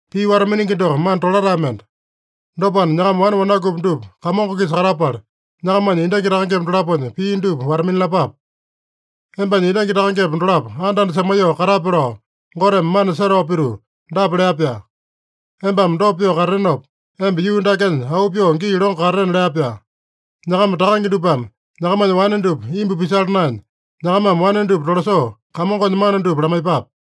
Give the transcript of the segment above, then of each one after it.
Pii wata-miningi doko mana tolatae mende. Dopana, nyakama wane wanakupi dupa Kamongo-kisa katapala, nyakamanya endangi takangepa dolaponya pii dupa wata-minalapape. “Embanya endangi takangepa dolapo anda-anda semaiyoo katape” lao, Goteme mana setao pituu dapa lea-pyaa: “Embame dopa pyoo katatenopa, emba yuu dakenya auu pyoo gii longo katatena” lea-pyaa. Nyakama takange dupame nyakamanya wane dupa imbu pisala naenya, nyakamame wane dupa tolasoo, Kamongonya mana dupa lamaiyepape.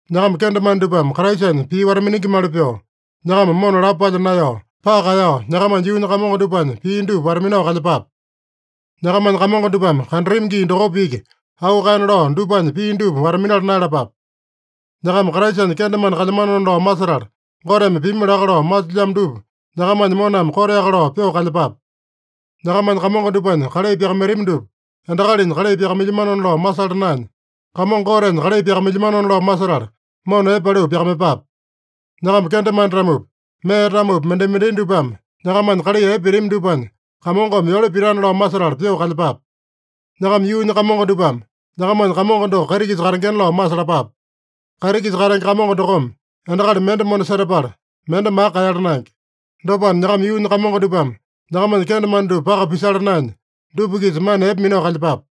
Nyakama kendemane dupame Kraisanya pii wata-miningimali pyoo, nyakama mona lapo palya naeyao, paka kaeyao, nyakamanya yuunya kamongo dupanya pii dupa wata-minao kalyepape. Nyakamanya kamongo dupame kandatami gii dokopa iki auu kaena lao dupanya pii dupa wata-minala naeyalapape. Nyakama Kraisanya kendemane kalyamanona lao masetala, Goteme pimi laka lao masilyamo dupa nyakamanya moname koteaka lao pyoo kalyepape. Nyakamanya kamongo dupanya kalai pyakamaitami dupa, endakalinya kalai pyakamailyamano lao masala naenya, Kamongo Gotenya kalai pyakamailyamano lao masetala mona epe paliu pyakamaiyepape. Nyakama kendemane-tamopi, mee-tamopi, mendai-mendai dupame nyakamanya kalai epe pitami dupanya, Kamongome yole pitana lao masetala pyoo kalyepape. Nyakama yuunya kamongo dupame nyakamanya Kamongo doko kaiti-kisa katengena lao masalapape. Kaiti-kisa katenge Kamongo dokome endakali mende mona setapala, mende maka kaeyala naenge. Dopana, nyakama yuunya kamongo dupame nyakamanya kendemane dupa paka pisala naenya, dupa-kisa mana epe minao kalyepape.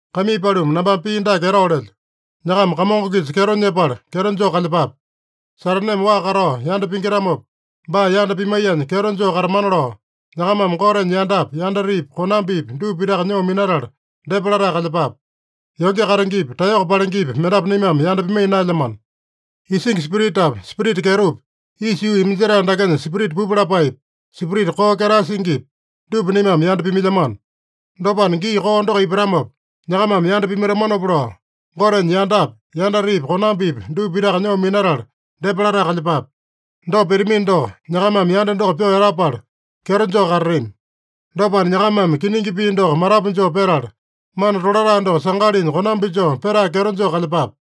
Kaimii paluma, nambame pii dake etao lelyo: Nyakama Kamongo-kisa kyeto nyepala, kyeto joo kalyepape. Sataneme waa katao yanda pingitamopa, baa yanda pimaiyanya kyeto joo katamana lao, nyakamame Gotenya yandapi, yandatepi, konambipi dupa pitaka nyoo minatala depa latae kalyepape. Yonge katengepi, taeyoko palengepi mendapu naimame yanda pimaiya naelyamano. Isingi spiritapi, spirita kyetopi, isa yuu iminjetae dakenya spirita pupu lapaepi, spirita koo ketae singipi, dupa naimame yanda pimailyamano. Dopana, gii koo doko ipatamopa, nyakamame yanda pimaitamanopa lao, Gotenya yandapi, yandatepi, konambipi dupa pitaka nyoo minatala depa latae kalyepape. Dopa pitamino doko, nyakamame yanda doko pyoo etapala kyeto joo katatami. Dopana, nyakamame kiningi pii doko matapu joo petala, mana tolatae doko sangalinya konambi joo petae kyeto joo kalyepape.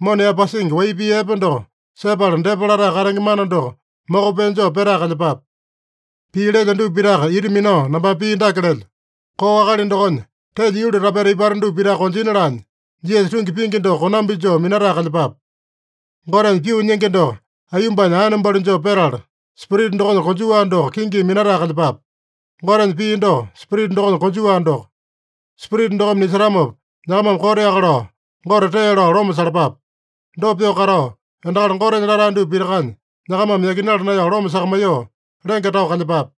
Mona yaepasingi wai pii epe doko sepala depa latae katenge mana doko moko pee joo petae kalyepape. Pii lelyo dupa pitaka ita minao nambame pii dake lelyo: Koo akali dokonya telya yuli tapeta ipata dupa pitaka konjina laanya, Jisasa tungi pingi doko konambi joo minatae kalyepape. Gotenya pyoo nyingi doko aiyombanya aene balu joo petala, Spirita dokonya konjuwa doko kingimi minatae kalyepape. Gotenya pii doko, Spirita dokonya konjuwa doko. Spirita dokome nisetamopa, nyakamame koteaka lao Gote tee lao loma salapape. Dopa pyoo katao, endakali Gotenya latae dupa pitakanya nyakamame yakinala naeyao loma sakamaiyoo, lenge tao kalyepape.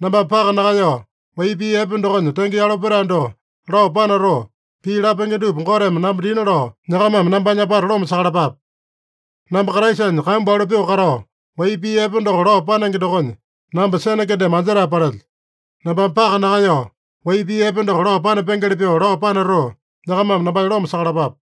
Nambame paka nakaeyao, wai pii epe dokonya tenge yalo petae doko lao panatoo, pii lapenge dupa Goteme namba dina lao, nyakamame nambanya apata loma sakalapape. Namba Kraisanya kambu alo pyoo katao, wai pii epe doko lao panenge dokonya, namba sene kendeme anjetae palelyo. Nambame paka nakaeyao, wai pii epe doko lao panapengeli pyoo lao panatoo, nyakamame nambanya loma sakalapape.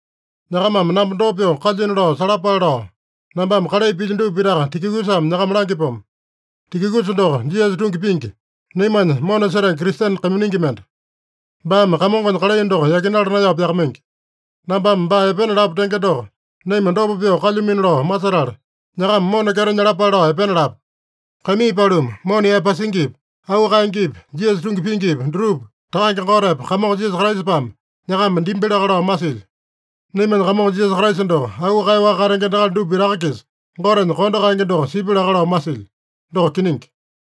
Nyakamame namba dopa pyoo kalyuino lao salapale lao, nambame kalai pilyo dupa pitaka Tikikusame nyakama langyapomo. Tikikusa doko Jisasa tungi pingi, naimanya mona setenge Kristene kaiminingi mende. Baame Kamongonya kalai doko yakinala naeyao pyakamaingi. Nambame baa epena lapu tenge doko, naima dopa pyoo kalyumino lao masetala, nyakama mona kyeto nyalapale lao epena lapu. Kaimii paluma, mona yaepasingipi, auu kaengepi, Jisasa tungi pingipi, dutupa Takange Gotepa Kamongo Jisasa Kraisapame nyakama dimbi laka lao masilyo. Naimanya Kamongo Jisasa Kraisa doko auu kaeyaowaka katenge endakali dupa pitaka-kisa Gotenya kondo kaenge doko sipya laka lao masilyo. Doko kiningi.